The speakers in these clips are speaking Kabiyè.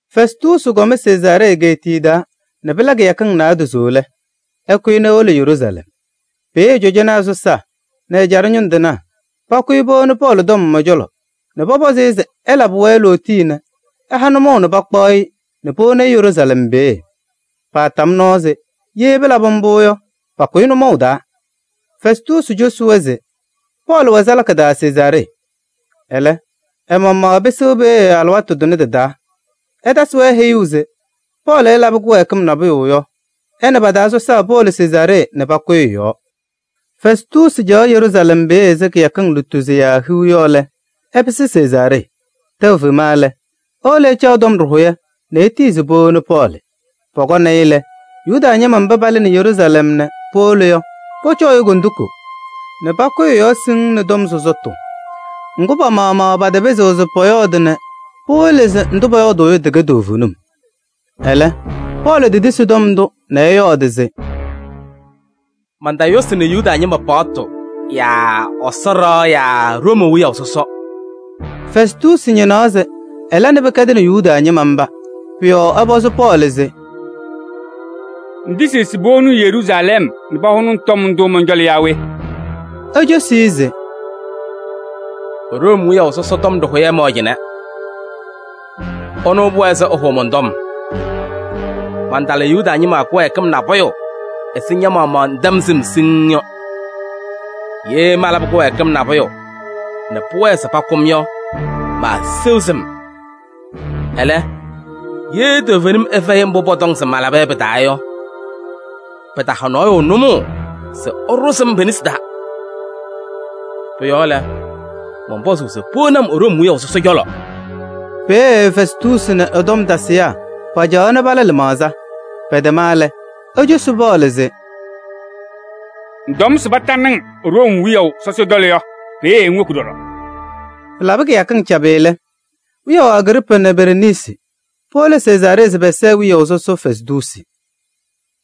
Fɛstuusi kɔm Sezaaree egeetiye taa nɛ pɩla kɩyakɩŋ naadozo lɛ, ɛkʋyɩ nɛ ewolo Yeruusalɛm. Peeye cɔjɔnaa sɔsaa nɛ ɛjaɖɛ ñʋŋ tɩnaa pakʋyaa nɛ powoni Pɔɔlɩ tɔm ɛ-cɔlɔ nɛ pɔpɔzɩ-ɩ se ɛlabɩ-wɛ lootiye nɛ ɛha-wɛ nʋmɔʋ nɛ pakpaɣ-ɩ nɛ powoni Yeruusalɛm peeye. Paatam nɔɔ se ye pɩlabɩ mbʋ yɔ, pakʋ-ɩ nʋmɔʋ taa. Fɛstuusi cosi-wɛ se Pɔɔlɩ wɛ salaka taa Sezaaree. Ɛlɛ, ɛ-maɣmaɣ ɛpɩsɩɣ peeye alɩwaatʋ tʋnɛ tɩ-taa. Ɛtasɩ-wɛ heyuu se ye Pɔɔlɩ ɛlabɩ kɩwɛɛkɩm nabʋyʋ yɔ, ɛ nɛ pa-taa sɔsaa powolo Sezaaree nɛ pakʋyɩ ɛ-yɔɔ. Fɛstuusi caɣ Yeruusalɛm peeye ɛzɩ kɩyakɩŋ lutozo yaa hiu yɔ lɛ, ɛpɩsɩ Sezaaree. Tɛʋ fema lɛ, ewolo ɛcaɣ tɔm ɖɩhʋyɛ nɛ etiyi se powoni Pɔɔlɩ. Pɔkɔnɩ-ɩ lɛ, Yuda ñɩma mba paalɩnɩ Yeruusalɛm nɛ powolo yɔ, pɔcɔɔ-ɩ kondiko nɛ pakʋyɩ ɛ-yɔɔ siŋŋ nɛ tɔm sɔsɔtʋ. Ŋgʋ, pa-maɣmaɣ pataapɩzɩɣ se pɔyɔɔdɩ nɛ pawɩlɩ se ndʋ pɔyɔɔdʋʋ yɔ tɩkɛ toovenim. Ɛlɛ Pɔɔlɩ tetisi tɔm ndʋ nɛ ɛyɔɔdɩ se: “Mantayʋsɩnɩ Yuda ñɩma paɣtʋ yaa Ɛsɔ ɖɩɣa yaa Room wiyaʋ sɔsɔ.” Fɛstuusi ñɩnaɣ se ɛla nɛ pɩkɛdɩnɩ Yuda ñɩma mba. Pʋ-yɔɔ ɛpɔzɩ Pɔɔlɩ se: “Ŋtisiɣ se powoni-ŋ Yeruusalɛm nɛ pahʋnɩ-ŋ tɔm ndʋ mɔn-cɔlɔ yaa we?” Ecosi se: “Room wiyaʋ sɔsɔ tɔm ɖɩhʋyɛ mɛwɛ cɩnɛ. Ɛnʋ pʋwɛɛ se ɛhʋʋ mɔn-tɔm. Mantala Yuda ñɩma kɩwɛɛkɩm nabʋyʋ ɛzɩ ña-maɣmaɣ ŋtɛm sɩm siŋŋ yɔ. Ye malabɩ kɩwɛɛkɩm nabʋyʋ nɛ pʋwɛɛ se pakʋ-m yɔ, maaseɣ sɩm. Ɛlɛ, ye toovenim ɛfɛyɩ mbʋ pɔtɔŋ se malaba yɔ pɩ-taa yɔ, pɩtaha nɔɔyʋ nʋmɔʋ se ɛɖʋzɩ-m pe-nesi taa. Pʋ-yɔɔ lɛ, mɔnpɔzʋʋ se powoni-m Room wiyaʋ sɔsɔ cɔlɔ.” Peeye Fɛstuusi nɛ ɛ-tɔm tasɩyaa pacaɣaɣ nɛ pala lɩmaɣza. Pɛtɛma lɛ, ecosi Pɔɔlɩ se: “Ŋtɔm se patanɩ-ŋ Room wiyaʋ sɔsɔ cɔlɔ yɔ, peeye ŋwoki ɖɔɖɔ.” Pɩlabɩ kɩyakɩŋ cabɩ lɛ, wiyaʋ Agriipaa nɛ ɛ-kɔɔ Bereniisi powolo Sezaaree se pɛsɛɛ wiyaʋ sɔsɔ Fɛstuusi.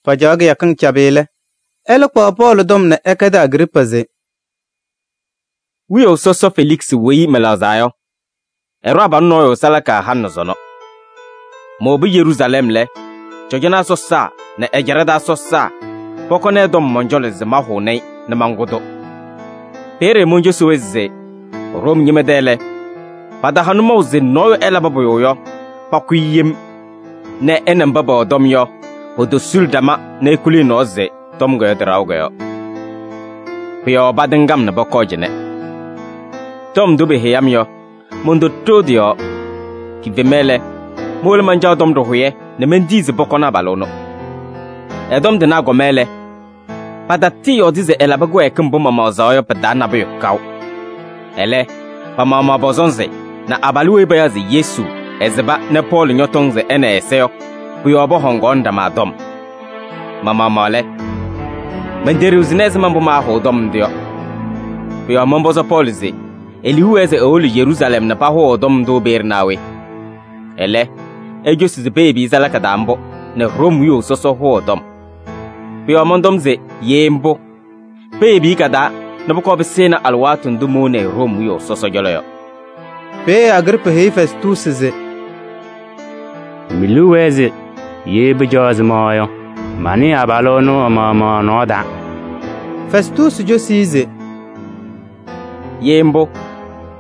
Pacaɣ kɩyakɩŋ cabɩ lɛ, ɛlɛ kpaɣ Pɔɔlɩ tɔm nɛ ɛkɛdɩ Agriipaa se: “Wiyaʋ sɔsɔ Feliksɩ weyi mɛlɛɣzaa yɔ, ɛɖʋ abalʋ nɔɔyʋ salaka halɩ nɛ sɔnɔ. Mowobi Yeruusalɛm lɛ, cɔjɔnaa sɔsaa nɛ ɛjaɖɛ taa sɔsaa pɔkɔnɩ ɛ-tɔm mɔn-cɔlɔ se mahʋnɩ-ɩ nɛ mankʋ-tʋ. Peeye moncosi-wɛ se Room ñɩma tɛ lɛ, pɩtaha nʋmɔʋ se nɔɔyʋ ɛlabɩ pʋyʋ yɔ, pakʋ-ɩ yem nɛ ɛ nɛ mba pɛwɛ tɔm yɔ potosuli ɖama nɛ ekuli ɛ-nɔɔ se tɔm yɔ, tɩ-ɖaɣʋ yɔ. Pʋ-yɔɔ patɩŋ-m nɛ pɔkɔɔ cɩnɛ. Tɔm ndʋ peheyi-m yɔ, montoɖoo tɩ-yɔɔ: kifema lɛ, mowolo mancaɣ tɔm ɖɩhʋyɛ nɛ mentiyi se pɔkɔnɩ abalʋ ɛnʋ. Ɛ-tɔm tɩnaa kɔma lɛ, patatɩɩyɔɔdɩ se ɛlabɩ kɩwɛɛkɩm mbʋ mamaɣzaɣ yɔ pɩ-taa nabʋyʋ kaʋ. Ɛlɛ, pa-maɣmaɣ pɔ-sɔnzɩ nɛ abalʋ weyi payaɣ se Yesu, ɛsɩba nɛ Pɔɔlɩ ñɔtɔŋ se ɛ nɛ ɛ-ɛza yɔ, pʋ-yɔɔ pɔhɔŋaɣnɩ ɖama tɔm. Ma-maɣmaɣ lɛ, menteɖiɣzini ɛzɩma mbʋ maahʋʋ tɔm ndʋ yɔ. Pʋ-yɔɔ mɔnpɔzɩ Pɔɔlɩ se e-liu wɛɛ se ewolo Yeruusalɛm nɛ pahʋʋ ɛ-tɔm ndʋ peeye naa we? Ɛlɛ, ecosi se peyebi-i salaka taa mbʋ nɛ Room wiyaʋ sɔsɔ hʋʋ ɛ-tɔm. Pʋ-yɔɔ mɔntɔm se: ye mbʋ, peyebi-i ka-taa nɛ pʋkɔɔ pɩsɩnɩ alɩwaatʋ ndʋ mowoni-i Room wiyaʋ sɔsɔ cɔlɔ yɔ.” Peeye Agriipaa heyi Fɛstuusi se: “Me-liu wɛɛ se pɩcaɣ ɛzɩma yɔ, manɩɩ abalʋ ɛnʋ ɛ-maɣmaɣ ɛ-nɔɔ taa.” Fɛstuusi cosi se: “Ye mbʋ,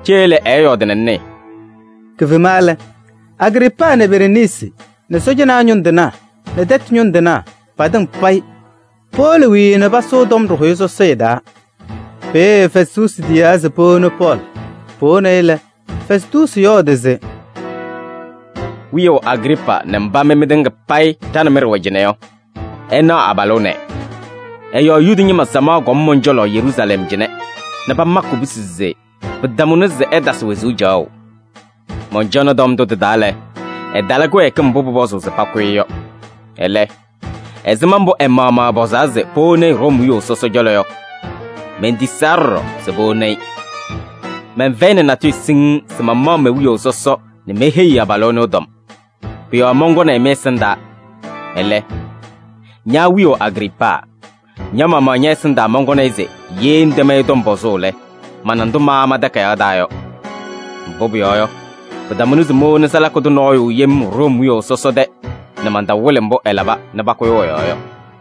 cee lɛ ɛɛyɔɔdɩ nɛ ŋnɩɩ.” Kifema lɛ, Agriipaa nɛ ɛ-halʋ Bereniisi nɛ sɔɔjanaa ñʋŋ tɩnaa nɛ tɛtʋ ñʋŋ tɩnaa patɩŋa payɩ powolo wiii nɛ pasʋʋ tɔm ɖɩhʋyɛ sɔsɔɖɛ taa. Peeye Fɛstuusi tiyaa se powoni Pɔɔlɩ. Powonɩ-ɩ lɛ, Fɛstuusi yɔɔdɩ se: “Wiyaʋ Agriipaa nɛ mba mɩ mɩtɩŋa payɩ ɖa nɛ mɩ ɖɩwɛ cɩnɛ yɔ, ɩnaɣ abalʋ ɛnɛ, ɛ-yɔɔ Yuda ñɩma samaɣ kɔm mɔn-cɔlɔ Yeruusalɛm cɩnɛ nɛ pamakɩ kubusi se pɩtamʋnɩ se ɛtasɩ wezuu caɣʋ. Mɔncɔnɩ tɔm ndʋ tɩ-taa lɛ, ɛtala kɩwɛɛkɩm mbʋ pʋpɔzʋʋ se pakʋ-ɩ yɔ. Ɛlɛ, ɛzɩma mbʋ ɛ-maɣmaɣ ɛpɔzaa se powoni-i Room wiyaʋ sɔsɔ cɔlɔ yɔ, mentisaa ɖɔɖɔ se powoni-i. Mɛnfɛyɩnɩ natʋyʋ siŋŋ se mamaɣ me-wiyaʋ sɔsɔ nɛ meheyi-i abalʋ ɛnʋ ɛ-tɔm. Pʋ-yɔɔ mɔnkɔnɩ-ɩ mɩ-ɛsɩndaa. Ɛlɛ, ña wiyaʋ Agriipaa, ña-maɣmaɣ ñɛ- ɛsɩndaa mɔnkɔnɩ-ɩ se ye ŋtɛm-ɩ tɔm pɔzʋʋ lɛ, mana ndʋ maama takayaɣ taa yɔ. Mbʋ pʋyɔɔ yɔ, pɩtamʋnɩ se mowoni salaka tʋ nɔɔyʋ yem Room wiyaʋ sɔsɔ tɛ nɛ mantawɩlɩ mbʋ ɛlaba nɛ pakʋyʋʋ ɛ-yɔɔ yɔ.”